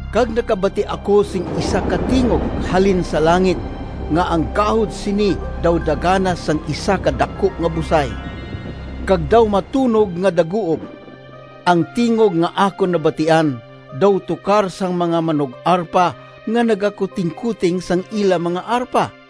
Kag nakabati ako sing isa ka tingog halin sa langit nga ang gahod sini daw daganas sang isa ka daku nga busay, kag daw matunog nga daguob. Ang tingog nga akon nabatian daw tukar sang mga manug-arpa nga nagakutingkoting sang ila mga arpa.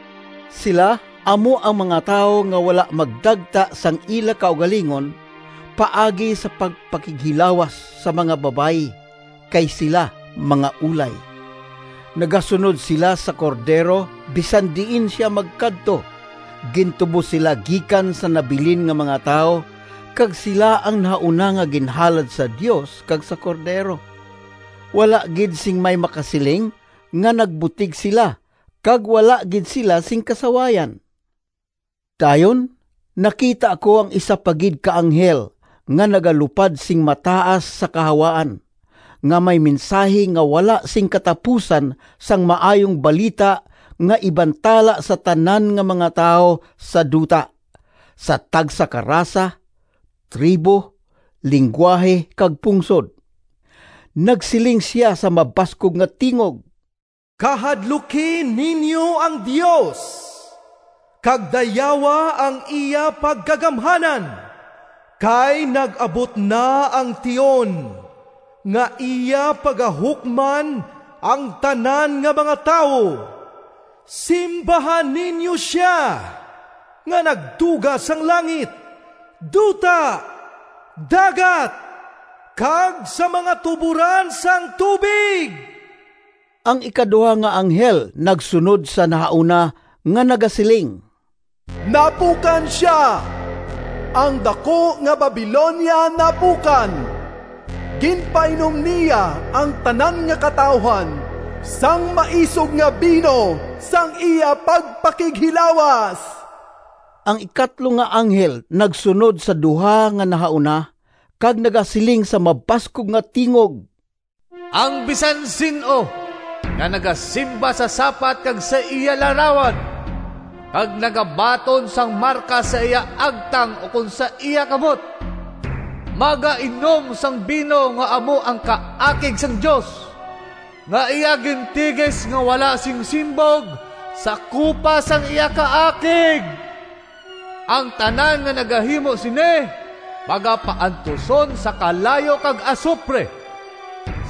Sila amo ang mga tawo nga wala magdagta sang ila kaugalingon paagi sa pagpakighilawas sa mga babayi, kay sila mga ulay. Nagasunod sila sa Cordero bisan diin sia magkadto. Gintubos sila gikan sa nabilin nga mga tawo kag sila ang nahauna nga ginhalad sa Dios kag sa Cordero. Wala gid sing may makasiling nga nagbutig sila, kag wala gid sila sing kasawayan. Dayon nakita ko ang isa pa gid ka anghel nga nagalupad sing mataas sa kahawaan, nga may mensahi nga wala sing katapusan sang Maayong Balita nga ibantala sa tanan nga mga tawo sa duta, sa tagsa ka rasa, tribo, linggwahe, kag pungsod. Nagsiling sia sa mabaskog nga tingog, “Kahadluki ninyo ang Dios kag dayawa ang iya pagkagamhanan! Kay nag-abot na ang tion nga iya pagahukman ang tanan nga mga tawo. Simbaha ninyo sia nga nagtuga sang langit, duta, dagat, kag sang mga tuboran sang tubig!” Ang ikaduha nga anghel nagsunod sa nahauna nga nagasiling, “Napukan sia! Ang daku nga Babilonia napukan! Ginpainom niya ang tanan nga katawuhan sang maisog nga bino sang iya pagpakighilawas!” Ang ikatlo nga anghel nagsunod sa duha nga nahauna kag nagasiling sa mabaskog nga tingog, “Ang bisan sin-o nga nagasimba sa sapat kag sa iya larawan, kag nagabaton sang marka sa iya agtang ukon sa iya kamot, magainom sang bino nga amo ang kaakig sang Dios, nga iya gintigis nga wala sing simbog sa kupa sang iya kaakig! Ang tanan nga nagahimo sini pagapaantuson sa kalayo kag asupre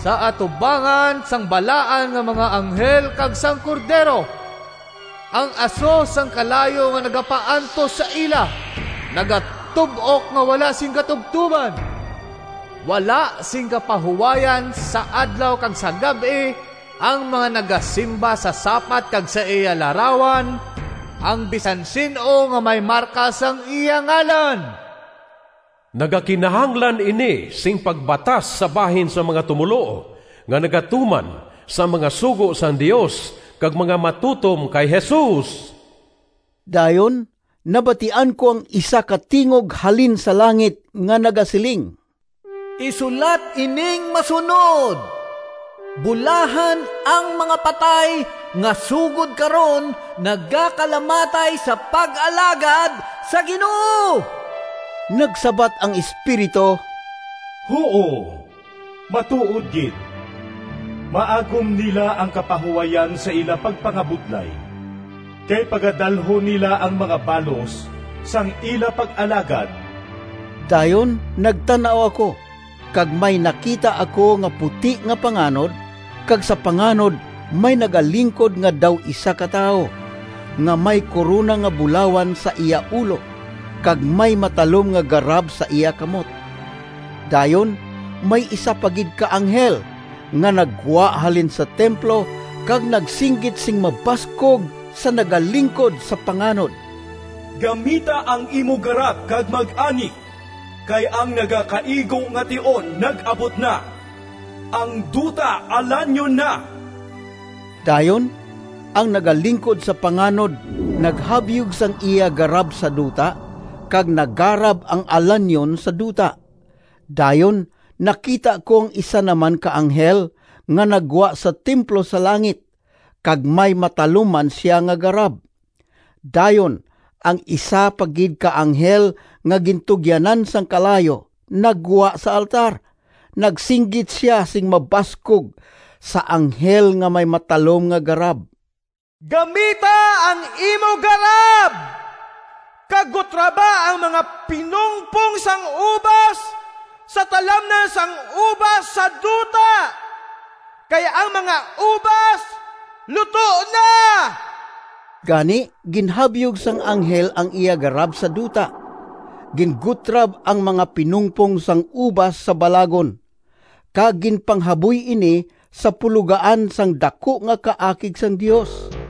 sa atubangan sang balaan nga mga anghel kag sang Cordero. Ang aso sang kalayo nga nagapaantos sa ila nagatub-ok nga wala sing katubtoban. Wala sing kapahuwayan sa adlaw kag sa gab-i ang mga nagasimba sa sapat kag sa iya larawan, ang bisan sin-o nga may marka sang iya ngalan.” Nagakinahanglan ini sing pagbatas sa bahin sang mga tumoluo, nga nagatuman sang mga sugo sang Dios kag mga matutom kay Jesus. Dayon nabatian ko ang isa ka tingog halin sa langit nga nagasiling, “Isulat ining masunod: Bulahan ang mga patay nga sugod karon nagakalamatay sa pag-alagad sa Ginoo!” Nagsabat ang Espiritu, “Huo, matuod gid, maagom nila ang kapahuwayan sa ila pagpangabudlay, kay pagadalhon nila ang mga balos sang ila pag-alagad.” Dayon nagtan-aw ako, kag may nakita ako nga puti nga panganod, kag sa panganod may nagalingkod nga daw isa ka tawo, nga may korona nga bulawan sa iya ulo, kag may matalom nga garab sa iya kamot. Dayon may isa pa gid ka anghel nga naggwa halin sa templo kag nagsinggit sing mabaskog sa nagalingkod sa panganod, “Gamita ang imo garab kag mag-ani, kay ang nagakaigo nga tion nag-abot na. Ang duta alanyon na!” Dayon ang nagalingkod sa panganod naghabyog sang iya garab sa duta, kag nagarab ang alanyon sa duta. Dayon nakita ko ang isa naman ka anghel nga naggwa sa templo sa langit, kag may matalom man sia nga garab. Dayon ang isa pa gid ka anghel nga gintugyanan sang kalayo naggwa sa altar. Nagsinggit sia sing mabaskog sa anghel nga may matalom nga garab, “Gamita ang imo garab, kag gutraba ang mga pinungpong sang ubas sa talamnan sang ubas sa duta, kay ang mga ubas luto na!” Gani ginhabyog sang anghel ang iya garab sa duta, gingutrab ang mga pinungpong sang ubas sa balagon, kag ginpanghaboy ini sa pulogaan sang daku nga kaakig sang Dios.